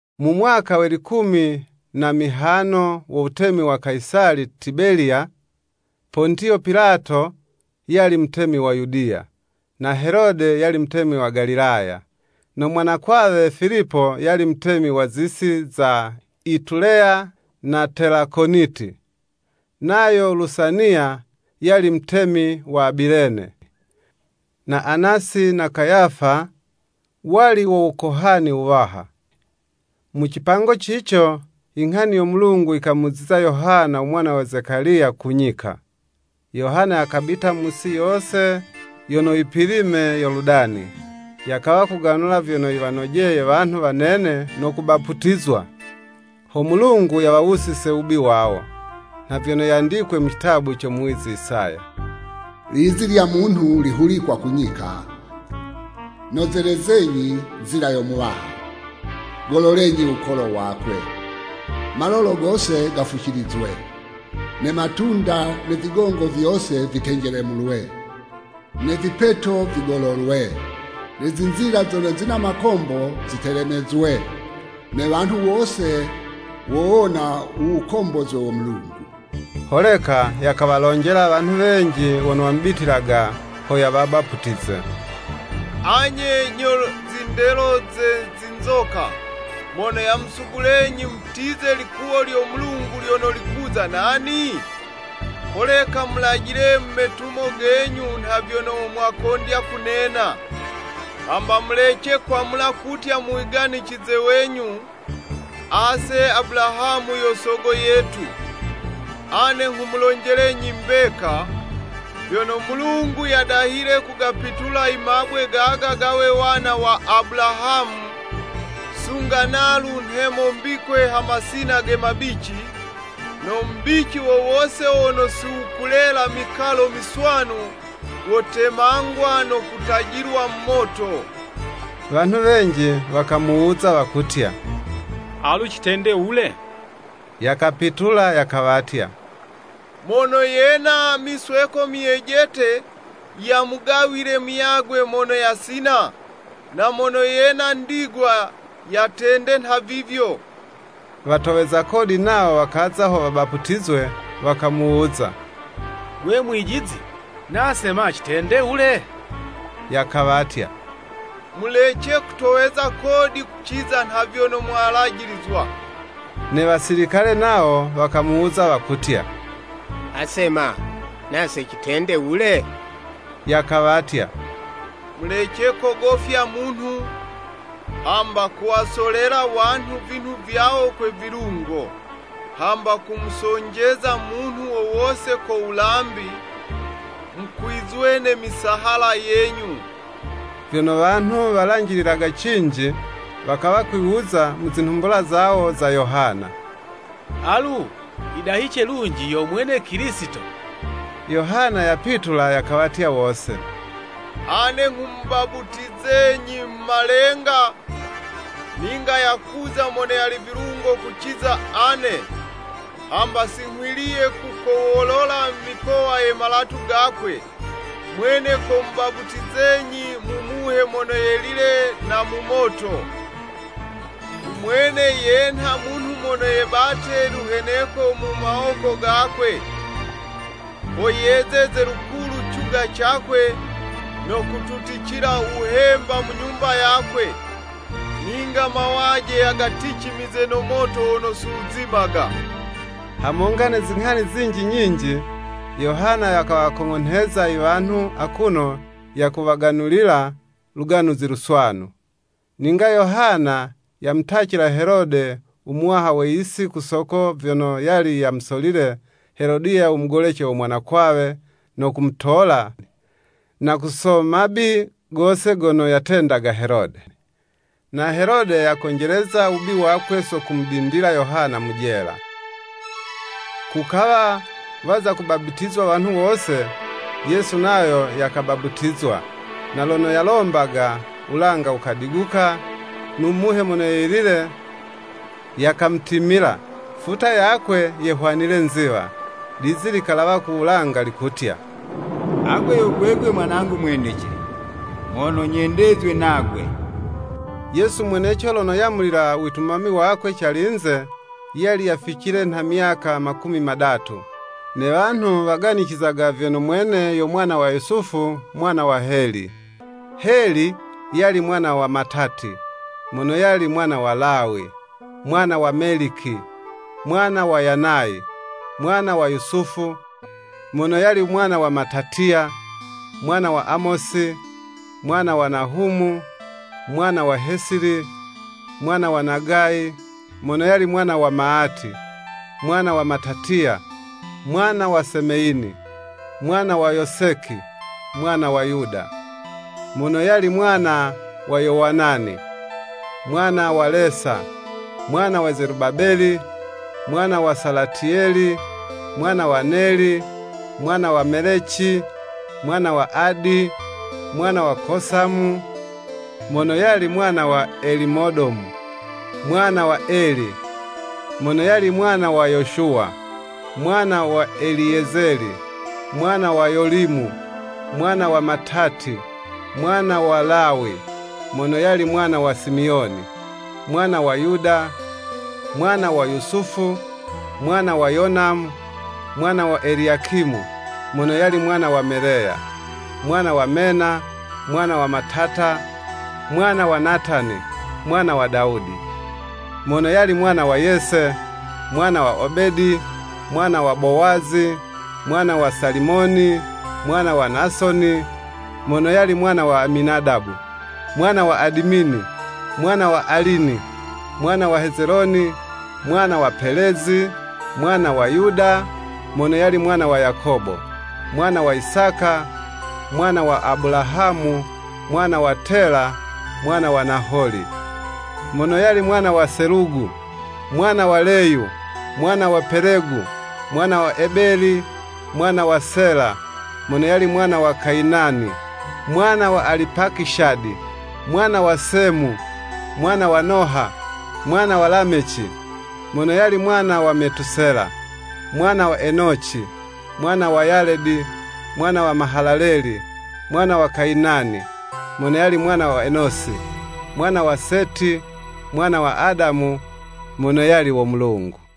Mu mwaka we likumi na mihano wo wutemi wa Kayisali Tibeliya, Pontiyo Pilato yali mutemi wa Yudiya, na Helode yali mutemi wa Galilaya, no mwanakwawe Filipo yali mutemi wa zi'si za Ituleya na Telakoniti, nayo Lusaniya, yali mutemi wa Abilene, na Anasi na Kayafa wali wo wukohani wuwaha. Mu cipango cico, i nghani yo Mulungu yikamuziza Yohana u mwana wa Zekaliya ku nyika. Yohana yakabita mu yisi yose yono yipilime Yoludani, yakawa kuganula vyono yiwanojeye wanhu wanene no kubaputizwa, ho Mulungu yawawusize wubi wawo. Nha vyono yandikwe mu citabu co muwizi Isaya, “Lizi lya munhu likuhulikwa ku nyika, Nozelezenyi nzila yo Muwaha, Gololenyi wukolo wakwe, Malolo gose gafucilizwe, Ne matunda ne vigongo vyose vitenjelemulwe, Ne vipeto vigololwe, Ne zinzila zono zina makombo zitelemezwe. Ne wanhu wose wowona u wukombozwe wo Mulungu.” Holeka yakawalonjela wanhu wenji wono wamubitilaga ho yawabaputize, “Anye nyo zindelo ze zinzoka, mono yamusugulenyi mutize likuwo lyo Mulungu lyono likuza nani? Holeka mulajile mu metumo genyu nha vyono mwakondya kunena.” Hamba mulece kwamula kutya mu wiganicize wenyu, “Ase Abulahamu yo sogo yetu.” Ane nghumulonjelenyi mbeka, vyono Mulungu yadahile kugapitula i mabwe gaga gawe wana wa Abulahamu. Sunga nalu nhemo mbikwe ha masina ge mabici, no mubici wo wose wono siwukulela mikalo miswanu, wotemangwa no kutajilwa mu moto. Wanhu wenji wakamuwuza wakutya, “Alu citende wule?” Yakapitula yakawatya, “Mono yena misweko myejete, yamugawile muyagwe mono yasina, na mono yena ndigwa, yatende nhavivyo.” Watoweza kodi nawo wakaza ho wabaputizwe, wakamuwuza, “Gwe mwijizi, na'se ma citende wule?” Yakawatya, “Mulece kutoweza kodi kuciza nha vyono mwalajilizwa.” Ne wasilikale nawo wakamuwuza wakutya, “Ase ma, nase citende wule?” Yakawatya, “Mulece kogofya munhu, hamba kuwasolela wanhu vinhu vyawo kwe vilungo, hamba kumusonjeza munhu wo wose ko wulambi, mukwizwe ne misahala yenyu.” Vyono wanhu walanjililaga cinji, wakawa kwiwuza mu zinhumbula zawo za Yohana, “Alu yidahice lunji yo mwene Kilisito?” Yohana yapitula yakawatya wose, “Ane nghumubaputizenyi mu malenga, ninga yakuza mono yali vilungo kuciza ane, hamba si nghwiliye kukowolola mikowa ye malatu gakwe, mwene komubaputizenyi mu Muhe Mono Yelile na mu Moto. U mwene yenha munhu mono yebate luheneko mu mawoko gakwe, ho yezeze lukulu cuga cakwe, no kututicila wuhemba mu nyumba yakwe; ninga mawaje yagaticimize no moto wono si wuzimaga.” Hamonga ne zinghani zinji nyinji, Yohana yakawakong'onheza i wanhu akuno yakuwaganulila Luganuzi Luswanu. Ninga Yohana yamutacila Helode u muwaha we yisi ku soko vyono yali yamusolile Helodiya u mugolece wo mwanakwawe, no kumutola, na ku so mabi gose gono yatendaga Helode. Na Helode yakonjeleza wubi wakwe so kumudindila Yohana mu jela. Kukawa waza kubaputizwa wanhu wose, Yesu nayo yakabaputizwa, na lono yalombaga, wulanga wukagubuka, no Muhe Mono Yelile yakamutimila, futa yakwe, yehwanile nziwa, lizi likalawa ku wulanga likutya, “Agwe yo gwegwe Mwanangu mwendece, mono nyendezwe nagwe.” Yesu mweneco lono yamulila u witumami wakwe calinze, yali yaficile nha myaka makumi madatu, ne wanhu waganicizaga vyono mwene yo mwana wa Yusufu mwana wa Heli. Heli yali mwana wa Matati, mono yali mwana wa Lawi, mwana wa Meliki, mwana wa Yanayi, mwana wa Yusufu, mono yali mwana wa Matatiya, mwana wa Amosi, mwana wa Nahumu, mwana wa Hesili mwana wa Nagayi, mono yali mwana wa Maati, mwana wa Matatiya, mwana wa Semeyini, mwana wa Yoseki, mwana wa Yuda, mono yali mwana wa Yowanani, mwana wa Lesa, mwana wa Zelubabeli, mwana wa Salatiyeli, mwana wa Neli, mwana wa Meleci, mwana wa Adi, mwana wa Kosamu, mono yali mwana wa Elimodomu, mwana wa Eli, mono yali mwana wa Yoshuwa, mwana wa Eliyezeli, mwana wa Yolimu, mwana wa Matati, mwana wa Lawi, mono yali mwana wa Simiyoni, mwana wa Yuda, mwana wa Yusufu mwana wa Yonamu, mwana wa Eliyakimu, mono yali mwana wa Meleya, mwana wa Mena, mwana wa Matata, mwana wa Natani, mwana wa Dawudi, mono yali mwana wa Yese, mwana wa Obedi, mwana wa Bowazi, mwana wa Salimoni, mwana wa Nasoni, mono yali mwana wa Aminadabu, mwana wa Adimini, mwana wa Alini, mwana wa Hezeloni, mwana wa Pelezi, mwana wa Yuda, mono yali mwana wa Yakobo, mwana wa Isaka, mwana wa Abulahamu, mwana wa Tela, mwana wa Naholi, mono yali mwana wa Selugu, mwana wa Leyu, mwana wa Pelegu, mwana wa Ebeli mwana wa Sela, mono yali mwana wa Kayinani, mwana wa Alipakishadi, mwana wa Semu, mwana wa Noha, mwana wa Lameci, mono yali mwana wa Metusela, mwana wa Enoci, mwana wa Yaledi, mwana wa Mahalaleli, mwana wa Kayinani, mono yali mwana wa Enosi, mwana wa Seti, mwana wa Adamu, mono yali wo Mulungu.